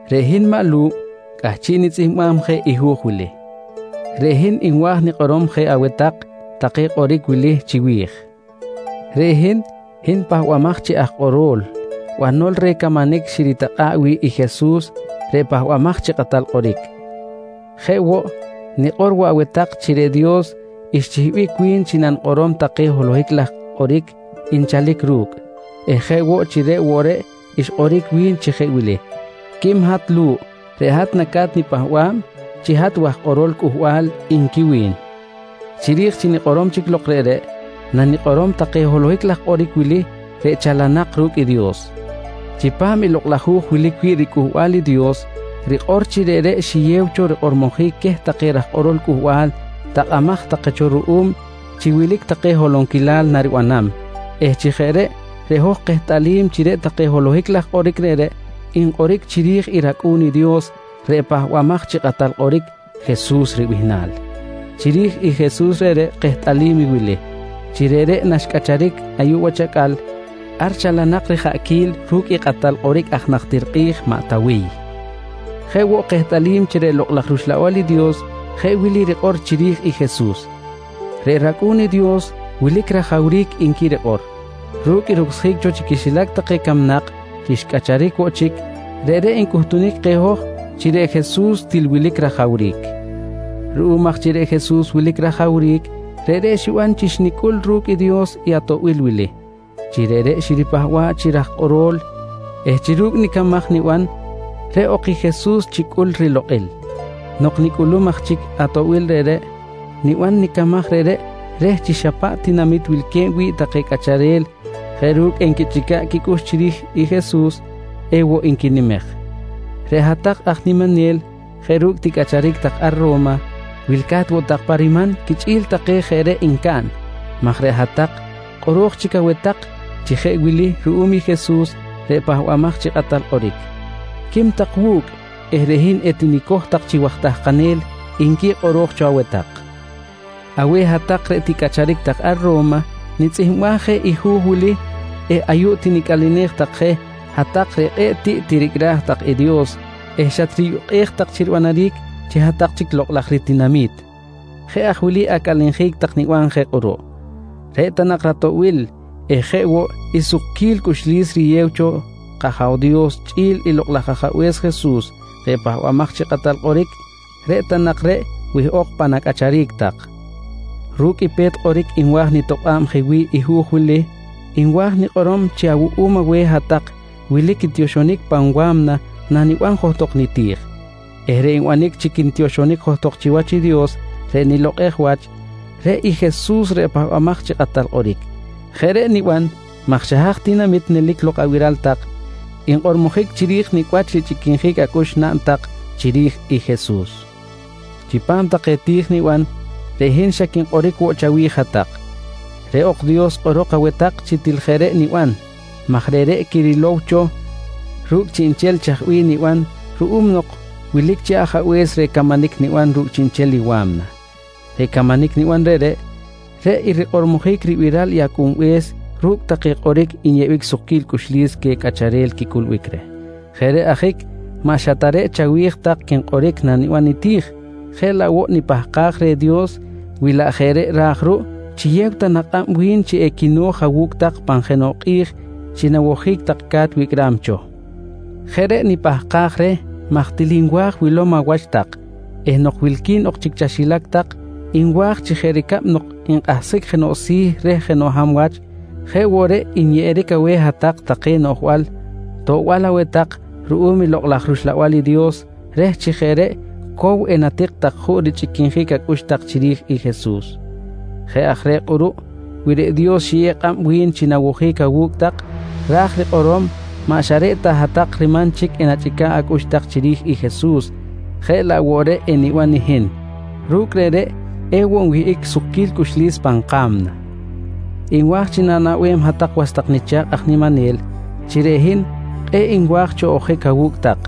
Reꞌ hin maꞌ Lu̱ꞌ cꞌahchiꞌ nitzꞌihmbam je i hu̱j wili. Reꞌ hin nwa̱j nikꞌorom je aweh tak take kꞌoric wili chiwi̱j: Reꞌ hin, hin pahbamaj chi aj kꞌoro̱l, banol reh camanic xiritakꞌa̱ꞌ wi̱ꞌ i Jesus reꞌ Pahbamaj chi Kꞌatal Kꞌoric. Jeꞌ woꞌ, nikꞌor woꞌ aweh tak chi reꞌ Dios xchihbic wi̱n chi nanikꞌorom take holohic laj kꞌoric nchalic ru̱cꞌ eh jeꞌ woꞌ chi reꞌ woꞌ reꞌ xkꞌoric wi̱n chi jeꞌ wili: «Quim hat Lu̱ꞌ, reꞌ hat naca̱t nipahba̱b chi hat waj kꞌoro̱l Cꞌuhbal, nqui wi̱n. Chiri̱j chi nikꞌorom chic lok reꞌreꞌ, nanikꞌorom take holohic laj kꞌoric wili reꞌ chalanak ru̱cꞌ i Dios: Chipam i Lokꞌ laj Hu̱j wilic wi̱ꞌ riCꞌuhbal i Dios rikꞌor chi reꞌreꞌ xiyew cho rikꞌormojic queh take raj kꞌorol Cꞌuhbal takꞌamaj take cho ruꞌum chi wilic take holonquilal naribanam eh chi jeꞌ reꞌ, reꞌ hoj kehtꞌalim chi reꞌ take holohic laj kꞌoric reꞌreꞌ nkꞌoric chiri̱j i rAcꞌu̱n i Dios reꞌ Pahbamaj chi Kꞌatal Kꞌoric, Jesus ribihnal. Chiri̱j i Jesus reꞌreꞌ kehtꞌalim i wili: Chi reꞌreꞌ naxcꞌacharic ayuꞌ wach acꞌal ar chalanak rijaꞌquil ru̱cꞌ i kꞌatal kꞌoric aj najtir kꞌi̱j maꞌ Tawiy. Jeꞌ woꞌ kehtꞌalim chi reꞌ Lokꞌ laj rUxlabal i Dios jeꞌ wili rikꞌor chiri̱j i Jesus: «Reꞌ rAcꞌu̱n i Dios wilic rajawric, nqui rikꞌor. Ru̱cꞌ i rucsjic cho chi quixilac take camnak chi xcꞌacharic woꞌ chic, reꞌreꞌ ncꞌuhtunic keh hoj chi reꞌ Jesus til wilic rajawric. Ruꞌum aj chi reꞌ Jesus wilic rajawric, reꞌreꞌ xiban chi xnicꞌul ru̱cꞌ i Dios i atoꞌbil wili: Chi reꞌreꞌ xiripahba̱ꞌ chi raj kꞌoro̱l eh chi ru̱cꞌ nicamaj niban reꞌ ok i Jesus chicꞌul rilokꞌil. Nok nicꞌulum aj chic i atoꞌbil reꞌreꞌ, niban nicamaj reꞌreꞌ reh chi xa paꞌ tinamit wilque̱b wi̱ꞌ take cꞌacharel jeꞌ ru̱cꞌ enquichꞌica̱ꞌ quicꞌux chiri̱j i Jesus, ewoꞌ nquinimej. Reꞌ hat-tak aj niminel jeꞌ ru̱cꞌ ticꞌacharic tak ar Ro̱ma, wilca̱t woꞌ tak pa riman quichꞌi̱l take jeꞌ reꞌ ncaꞌn maj reꞌ hat-tak kꞌoro̱j chic aweh tak chi jeꞌ wili ruꞌum i Jesus reꞌ Pahbamaj chi Kꞌatal Kꞌoric: «Quim tak wu̱cꞌ eh reꞌ hin etinicoj tak chi waj tahkanel, nqui kꞌoro̱j cho aweh tak. Aweh hat-tak reꞌ ticꞌacharic tak ar Ro̱ma nitzꞌihmbaj je i hu̱j wili eh ayuꞌ tinicꞌalenej tak je hat-tak reꞌ kꞌe̱ꞌ tiꞌ tiricꞌraj tak i Dios eh xatriyukꞌej tak chi ribanaric chi hat-tak chic lokꞌ laj ritinami̱t. Jeꞌ aj wili acꞌalenjic tak niban je kꞌuruꞌ: Reꞌ ta nak ratoꞌbil eh jeꞌ woꞌ i sukquil cꞌuxlis riyew cho kAja̱w Dios chꞌi̱l i Lokꞌ laj Ajabe̱s Jesus reꞌ Pahbamaj chi Kꞌatal Kꞌoric, reꞌ ta nak reꞌ wihꞌok pan acꞌacharic tak. Ru̱cꞌ i pe̱t kꞌoric nwa̱j nitokꞌa̱b wi̱ꞌ nihu̱j wili, nwa̱j nikꞌorom chi awuꞌum aweh hat-tak wilic tioxonic pan wa̱mna naniban johtok niti̱j eh reꞌ nbanic chi quintioxonic johtok chiwach i Dios reꞌ nilokꞌej wach, reꞌ i Jesus reꞌ Pahbamaj chi Kꞌatal Kꞌoric. Jeꞌ reꞌ niban maj xa haj tinamit nelic lok abiral tak, nkꞌormojic chiri̱j nicꞌ wach richꞌiquinjic acꞌux naꞌn tak chiri̱j i Jesus. Chipam take ti̱j niban, reꞌ hin xa quinkꞌoric woꞌ chawi̱j hat-tak. Reꞌ ok Dios kꞌorok aweh tak chi til jeꞌ reꞌ niban maj reꞌreꞌ quirilow cho ru̱cꞌ chiꞌnchel chaj bih niban ruꞌum nok wilic cho chi Ajabe̱s reh camanic niban ru̱cꞌ chiꞌnchel i wa̱mna. Reꞌ camanic niban reꞌreꞌ, reꞌ i rikꞌormojic ribiral i Acꞌunbe̱s ru̱cꞌ take kꞌoric nyeꞌbic sukquil cꞌuxlis queh cꞌacharel quicꞌulbic reh. Jeꞌ reꞌ ajic maꞌ xa ta reꞌ chawi̱j tak quinkꞌoric naniban niti̱j jeꞌ laꞌ woꞌ nipahkaj reh Dios wi laꞌ jeꞌ reꞌ ra̱j ruꞌ, chiyew ta nak kꞌab wi̱n chi equino̱j awu̱cꞌ tak pan jenoꞌ kꞌi̱j chi nawojic tak ca̱t wicꞌram cho. Jeꞌ reꞌ nipahkaj reh maj til nwa̱j wilom awach tak eh nok wilqui̱n ok chic chaxilac tak nwa̱j chi jeꞌ ricab nok nkꞌahsjic jenoꞌ si̱ reh jenoꞌ hab wach jeꞌ woꞌ reꞌ nyeꞌeric aweh hat-tak take noꞌjbal toꞌbal aweh tak ruꞌum i Lok laj rUxlabal i Dios reh chi jeꞌ reꞌ cow enatik tak juꞌ richꞌiquinjic acꞌux tak chiri̱j i Jesus. Jeꞌ aj reꞌ kꞌuruꞌ wi reꞌ Dios xiyew kꞌab wi̱n chi nawojic awu̱cꞌ ra̱j rikꞌorom maꞌ xa reꞌ ta hat-tak riman chic enachꞌica̱ꞌ acꞌux tak chiri̱j i Jesus jeꞌ laꞌ woꞌ reꞌ eniban i hin. Ru̱cꞌ reꞌreꞌ ewoꞌ nwihꞌic sukquil cꞌuxlis pan ka̱mna. Nwa̱j chi na̱naꞌbem hat-tak was tak nicha̱kꞌ aj niminel chi reꞌ hin kꞌe̱ꞌ nwa̱j cho ojic awu̱cꞌ tak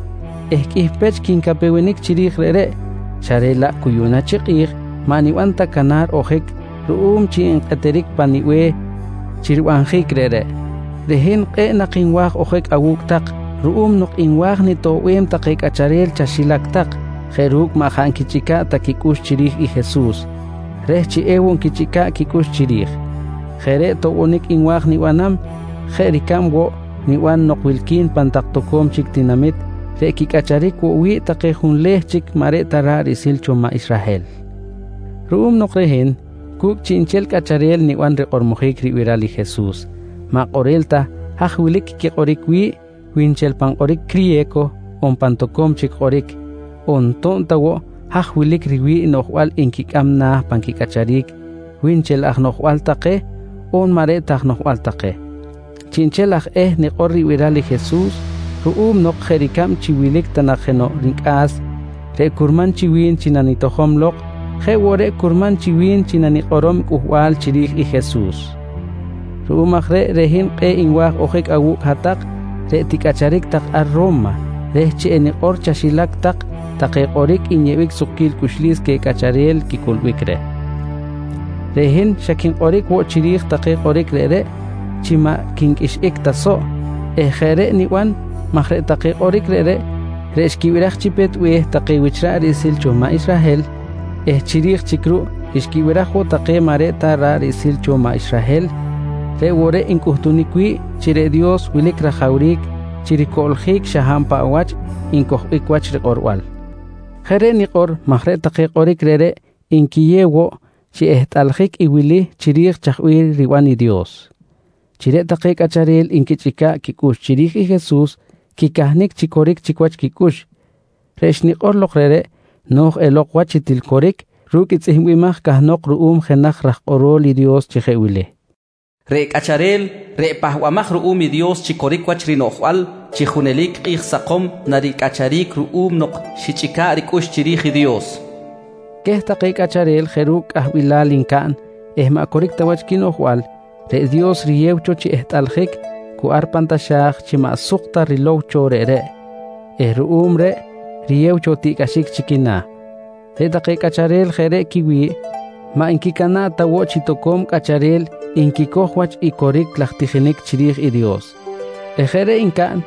eh qꞌuih pech quincapewenic chiri̱j reꞌreꞌ, xa reꞌ laꞌ cu yuꞌna chi kꞌi̱j maꞌ nibanam ta canar i ojic ruꞌum chi nkꞌeteric pa̱m nibe̱h chi ribanjic reꞌreꞌ. Reꞌ hin kꞌe̱ꞌ nak nwa̱j ojic awu̱cꞌ tak ruꞌum nok nwa̱j nitoꞌbem take cꞌacharel chaxilac tak jeꞌ ru̱cꞌ maꞌ jaꞌ nquichꞌica̱ꞌ ta quicꞌux chiri̱j i Jesus reh chi ewoꞌ nquichꞌica̱ꞌ ta quicꞌux chiri̱j. Jeꞌ reꞌ toꞌbonic nwa̱j nibanam jeꞌ ricab woꞌ niban nok wilqui̱n pan toco̱m chic tinamit reꞌ quicꞌacharic woꞌ wi̱ꞌ take junleh chic maꞌ reꞌ ta ra̱ꞌ riꞌsil take cho maꞌ Israhel ruꞌum nok reꞌ hin cu̱cꞌ chiꞌnchel cꞌacharel niban rikꞌormojic ribiral i Jesus, maꞌ kꞌorel ta haj wilic i kꞌoric quikꞌoric wi̱ꞌ wi nchel pan kꞌoric criye̱co on pan toco̱m chic kꞌoric on to̱b ta woꞌ haj wilic riwi̱ꞌ i noꞌjbal nquicꞌam na̱ pan quicꞌacharic, wi nchel aj noꞌjbal take on maꞌ reꞌ aj noꞌjbal take. Chiꞌnchel aj eh nikꞌor ribiral i Jesus ruꞌum nok jeꞌ ricab chi wilic ta nak jenoꞌ nicꞌa̱s reꞌ curman chi wi̱n chi nanitojom lok, jeꞌ woꞌ reꞌ curman chi wi̱n chi nanikꞌorom i cꞌuhbal chiri̱j i Jesus. Ruꞌum aj reꞌ, reꞌ hin kꞌe̱ꞌ nwa̱j ojic awu̱cꞌ hat-tak reꞌ ticꞌacharic tak ar Ro̱ma reh chi enikꞌor chaxilac tak take kꞌoric nyeꞌbic sukquil cꞌuxlis queh cꞌacharel quicꞌulbic reh. Reꞌ hin xa quinkꞌoric woꞌ chiri̱j take kꞌoric reꞌreꞌ chi maꞌ quinqꞌuixꞌic ta soꞌ eh jeꞌ reꞌ niban maj reꞌ take kꞌoric reꞌreꞌ, reꞌ xquibiraj chi pe̱t be̱h take wich ra̱ꞌ riꞌsil cho maꞌ Israhel eh chiri̱j chic ruꞌ xquibiraj woꞌ take maꞌ reꞌ ta ra̱ꞌ riꞌsil cho maꞌ Israhel reꞌ woꞌ reꞌ ncꞌuhtunic wi̱ꞌ chi reꞌ Dios wilic rajawric chi ricoꞌljic xa hab paꞌ wach ncojbic wach rikꞌorbal. Jeꞌ reꞌ nikꞌor maj reꞌ take kꞌoric reꞌreꞌ nquiyew woꞌ chi ehtꞌaljic i wili chiri̱j chaj bih riban i Dios: Chi reꞌ take cꞌacharel nquichꞌica̱ꞌ quicꞌux chiri̱j i Jesus, quicahnic chi coric chic wach quicꞌux. Reꞌ xnikꞌor lok reꞌreꞌ no̱j elok wach chi til coric ru̱cꞌ i tzꞌihmbimaj cahnok ruꞌum jenaj raj kꞌoro̱l i Dios chi jeꞌ wili: «Reꞌ cꞌacharel reꞌ pahbamaj ruꞌum i Dios chi coric wach rinoꞌjbal chi junelic kꞌi̱j sakom naricꞌacharic ruꞌum nok xichꞌica̱ꞌ ricꞌux chiri̱j i Dios, nqui xitzꞌihmbaj cho. Queh take cꞌacharel jeꞌ ru̱cꞌ cꞌahbilal ncaꞌn eh maꞌ coric ta wach quinoꞌjbal, reꞌ Dios riyeb cho chi ehtꞌaljic cu ar pan taxa̱j chi maꞌ suk ta rilow cho reꞌreꞌ eh ruꞌum reꞌ riyew cho tiꞌcꞌaxic chi quina̱. Reꞌ take cꞌacharel jeꞌ reꞌ quiwi̱ꞌ maꞌ nquicana̱ꞌ ta woꞌ chi toco̱m cꞌacharel nquicoj wach i coric laj tijinic chiri̱j i Dios eh jeꞌ reꞌ ncaꞌn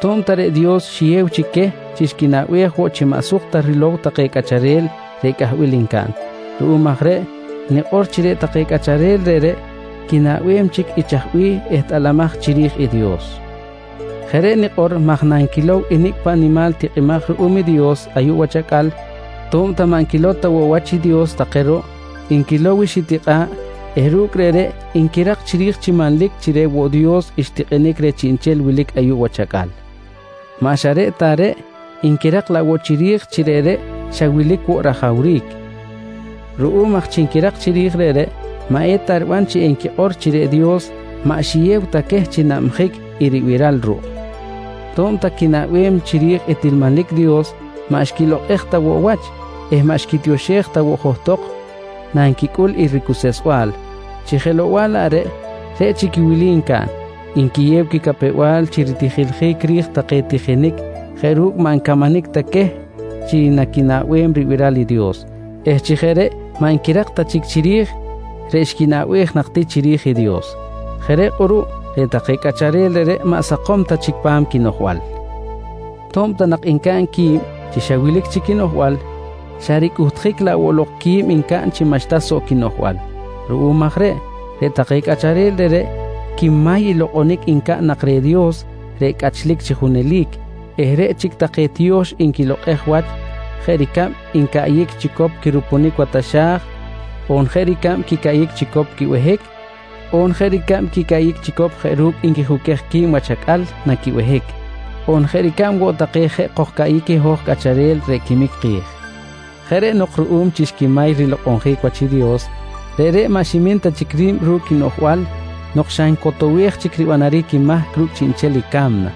to̱b ta reꞌ Dios xiyew chic queh chi xquinaꞌbej woꞌ chi maꞌ suk ta rilow take cꞌacharel reꞌ cꞌahbilal ncaꞌn. Ruꞌum aj reꞌ nikꞌor chi reꞌ take cꞌacharel reꞌreꞌ quinaꞌbem chic i chaj bih ehtꞌalamaj chiri̱j i Dios. Jeꞌ reꞌ nikꞌor maj nanquilow i nicꞌ paꞌ nimal tikꞌimaj ruꞌum i Dios ayuꞌ wach acꞌal, to̱b ta maꞌ nquilow ta woꞌ wach i Dios take ruꞌ, nquilow i xitikꞌa̱ꞌ eh ru̱cꞌ reꞌreꞌ nquirak chiri̱j chi manlic chi reꞌ woꞌ Dios xtikꞌinic reh chiꞌnchel wilic ayuꞌ wach acꞌal. Maꞌ xa reꞌ ta reꞌ, nquirak laꞌ woꞌ chiri̱j chi reꞌreꞌ xa wilic woꞌ rajawric. Ruꞌum aj chi nquirak chiri̱j reꞌreꞌ, maꞌ eta riban chi enquikꞌor chi reꞌ Dios maꞌ xiyew ta queh chi nabjic i ribiral ruꞌ. To̱b ta quinaꞌbem chiri̱j i til manlic Dios, maꞌ xquilokꞌej ta woꞌ wach eh maꞌ xquitioxej ta woꞌ johtok nanquicꞌul i ricuseꞌsbal. Chi jelow-bal laꞌ reꞌ, reꞌ chic i wili ncaꞌn: Nquiyew quicapew-bal chi ritijiljic ri̱j take tijinic jeꞌ ru̱cꞌ maꞌ ncamanic ta queh chi naquinaꞌbem ribiral i Dios eh chi jeꞌ reꞌ maꞌ nquirak ta chic chiri̱j reꞌ xquinaꞌbej nak ti chiri̱j i Dios. Jeꞌ reꞌ kꞌuruꞌ reꞌ take cꞌacharel reꞌreꞌ maꞌ sakom ta chic pa̱m quinoꞌjbal. To̱b ta nak ncaꞌn qui̱b chi xa wilic chic quinoꞌjbal, xa ricꞌuhtjic laꞌ woꞌ lok qui̱b ncaꞌn chi maꞌxta soꞌ quinoꞌjbal. Ruꞌum aj reꞌ, reꞌ take cꞌacharel reꞌreꞌ quimay i lokꞌonic ncaꞌn nak reh i Dios reꞌ cꞌachlic chi junelic eh reꞌ chic take tiyo̱x nquilokꞌej wach jeꞌ ricab quicaꞌyic chicop quirupunic wa taxa̱j, on jeꞌ ricab quicaꞌyic chicop quibehic, on jeꞌ ricab quicaꞌyic chicop jeꞌ ru̱cꞌ nquijuquej qui̱b wach acꞌal na quibehic, on jeꞌ ricab woꞌ take jeꞌ kojcaꞌyic i hoj cꞌacharel reꞌ quimic ki̱j. Jeꞌ reꞌ nok ruꞌum chi xquimay rilokꞌonjic wach i Dios, reꞌreꞌ maꞌ ximin ta chic ri̱b ru̱cꞌ quinoꞌjbal nok xa ncotowej chic ribanaric i mahc ru̱cꞌ chiꞌnchel i ca̱mna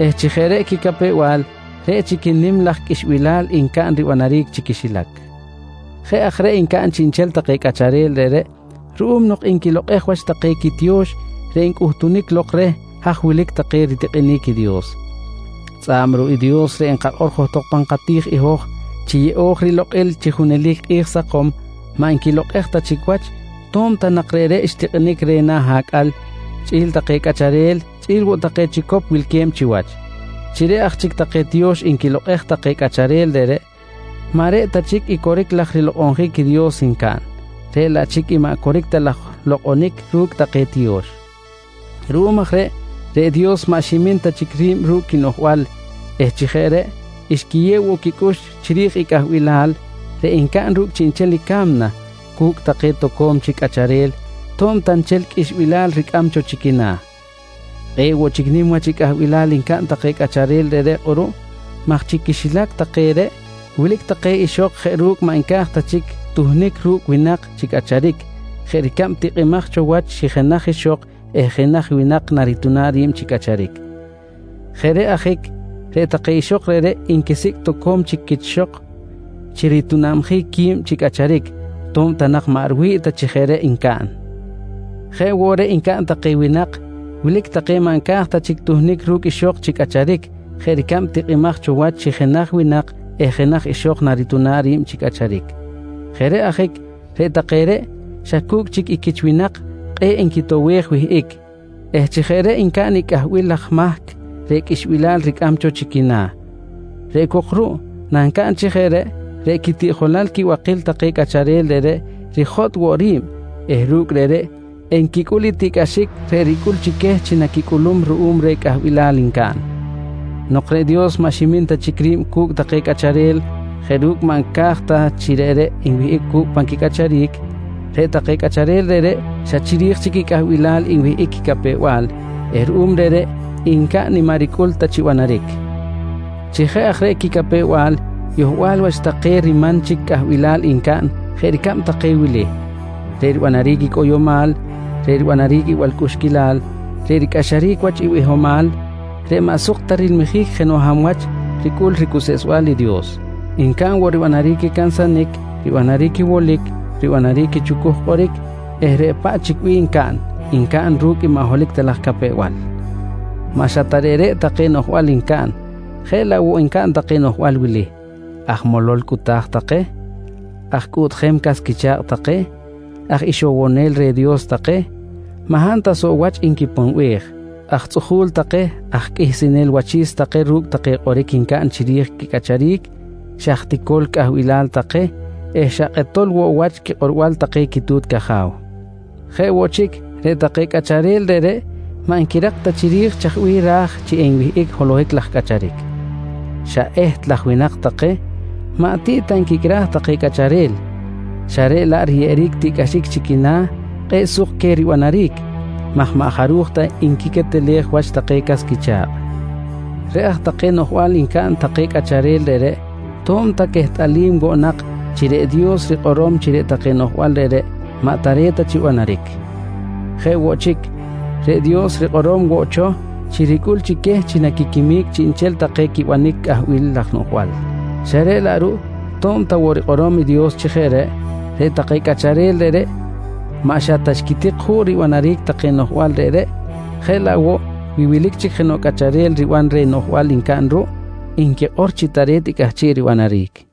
eh chi jeꞌ reꞌ quicapew-bal, reꞌ chic i nim laj qꞌuixbilal ncaꞌn ribanaric chi quixilac. Jeꞌ aj reꞌ ncaꞌn chiꞌnchel take cꞌacharel reꞌreꞌ ruꞌum nok nquilokꞌej wach take quitiyo̱x reꞌ ncꞌuhtunic lok reh haj wilic take ritikꞌinic i Dios. Tzꞌa̱b ruꞌ i Dios reꞌ nkakꞌor johtok pan kati̱j i hoj chi yeꞌo̱j rilokꞌil chi junelic kꞌi̱j sakom, maꞌ nquilokꞌej ta chic wach to̱b ta nak reꞌreꞌ xtikꞌinic reh na̱ acꞌal chꞌi̱l take cꞌacharel, chꞌi̱l woꞌ take chicop wilque̱b chiwach. Chi reꞌ aj chic take tiyo̱x nquilokꞌej take cꞌacharel reꞌreꞌ, maꞌ reꞌ ta chic i coric laj rilokꞌonjic i Dios ncaꞌn, reꞌ laꞌ chic i maꞌ coric ta laj lokꞌonic ru̱cꞌ take tiyo̱x. Ruꞌum aj reꞌ, reꞌ Dios maꞌ ximin ta chic ri̱b ru̱cꞌ quinoꞌjbal eh chi jeꞌ reꞌ xquiyew woꞌ quicꞌux chiri̱j i cꞌahbilal reꞌ ncaꞌn ru̱cꞌ chiꞌnchel i ca̱mna cu̱cꞌ take toco̱m chic cꞌacharel to̱b ta nchel qꞌuixbilal ricꞌam cho chi quina̱. Kꞌe̱ꞌ woꞌ chic nim wach i cꞌahbilal ncaꞌn take cꞌacharel reꞌreꞌ kꞌuruꞌ maj chi quixilac take reꞌ wilic take ixok jeꞌ ru̱cꞌ maꞌ nca̱j ta chic tuhnic ru̱cꞌ winak chi cꞌacharic jeꞌ ricab tikꞌimaj cho wach chi jenaj ixok eh jenaj winak narituna̱b ri̱b chi cꞌacharic. Jeꞌ reꞌ ajic reꞌ take ixok reꞌreꞌ nquisicꞌ toco̱m chic quich ixok chi ritunabjic qui̱b chi cꞌacharic to̱b ta nak maꞌ riwi̱ꞌ ta chi jeꞌ reꞌ ncaꞌn. Jeꞌ woꞌ reꞌ ncaꞌn take winak, wilic take maꞌ nca̱j ta chic tuhnic ru̱cꞌ ixok chi cꞌacharic jeꞌ ricab tikꞌimaj cho wach chi jenaj winak eh jenaj ixok narituna̱b ri̱b chi cꞌacharic. Jeꞌ reꞌ ajic reꞌ take reꞌ xa cu̱cꞌ chic i quich winak kꞌe̱ꞌ nquitowej wihꞌic eh chi jeꞌ reꞌ ncaꞌn i cꞌahbil laj mahc reꞌ qꞌuixbilal ricꞌam cho chi quina̱. Reꞌ cok ruꞌ nancaꞌn chi jeꞌ reꞌ, reꞌ quitiꞌjolal quibakil take cꞌacharel reꞌreꞌ rijotꞌ woꞌ ri̱b eh ru̱cꞌ reꞌreꞌ enquicꞌul i tiꞌcꞌaxic reꞌ ricꞌul chi queh chi naquicꞌulum ruꞌum reh cꞌahbilal ncaꞌn. Nok reꞌ Dios maꞌ ximin ta chic ri̱b cu̱cꞌ take cꞌacharel jeꞌ ru̱cꞌ maꞌ nca̱j ta chi reꞌreꞌ nwihꞌic cu̱cꞌ pan quicꞌacharic, reꞌ take cꞌacharel reꞌreꞌ xa chiri̱j chic i cꞌahbilal nwihꞌic quicapew-bal eh ruꞌum reꞌreꞌ ncaꞌn i maꞌ ricꞌul ta chi banaric. Chi jeꞌ aj reꞌ quicapew-bal, yohbal wach take riman chic cꞌahbilal ncaꞌn jeꞌ ricab take wili: Reꞌ ribanaric cꞌoyomal, reꞌ ribanaric i balcꞌuxquilal, reꞌ ricꞌaxaric wach i bihomal, reꞌ maꞌ suk ta rilmijic jenoꞌ hab wach ricꞌul ricuseꞌsbal i Dios. Ncaꞌn woꞌ ribanaric i cansanic, ribanaric i wolic, ribanaric i chucuj kꞌoric eh reꞌ paꞌ chic bih ncaꞌn, ncaꞌn ru̱cꞌ maꞌ holohic ta laj capew-bal. Maꞌ xa ta reꞌreꞌ take noꞌjbal ncaꞌn, jeꞌ laꞌ woꞌ ncaꞌn take noꞌjbal wili: Aj molol cꞌuta̱j take, aj cꞌuꞌtjem cas quicha̱kꞌ take, aj ixowonel reh Dios take, maꞌ hab ta soꞌ wach nquiponbej, aj tzꞌuju̱l take, aj qꞌuihsinel wachi̱s take ru̱cꞌ take kꞌoric ncaꞌn chiri̱j quicꞌacharic, xa aj ticol cꞌahbilal take eh xa kꞌetol woꞌ wach quikꞌorbal take quitu̱t caja̱w. Jeꞌ woꞌ chic, reꞌ take cꞌacharel reꞌreꞌ maꞌ nquirak ta chiri̱j chaj bih ra̱j chi enwihꞌic holohic laj cꞌacharic. Xa eht laj winak take, maꞌ tiꞌ ta nquicꞌraj take cꞌacharel xa reꞌ laꞌ riyeꞌeric tiꞌcꞌaxic chi quina̱ kꞌe̱ꞌ suk queh ribanaric maj maꞌ jaruj ta nquiquetelej wach take cas quicha̱kꞌ. Reꞌ aj reꞌ take noꞌjbal ncaꞌn take cꞌacharel reꞌreꞌ to̱b ta quehtꞌalim woꞌ nak chi reꞌ Dios rikꞌorom chi reꞌ take noꞌjbal reꞌreꞌ maꞌ tare̱t ta chi banaric. Jeꞌ woꞌ chic, reꞌ Dios rikꞌorom woꞌ cho chi ricꞌul chi queh chi naquiquimic chiꞌnchel take quibanic i cꞌahbil laj noꞌjbal, xa reꞌ laꞌ ruꞌ to̱b ta woꞌ rikꞌorom i Dios chi jeꞌ reꞌ, reꞌ take cꞌacharel reꞌreꞌ maꞌ xa ta xquitik juꞌ ribanaric take noꞌjbal reꞌreꞌ, jeꞌ laꞌ woꞌ wi wilic chic jenoꞌ cꞌacharel riban reh i noꞌjbal ncaꞌn ruꞌ nquikꞌor chi tare̱t i cꞌahchiꞌ ribanaric.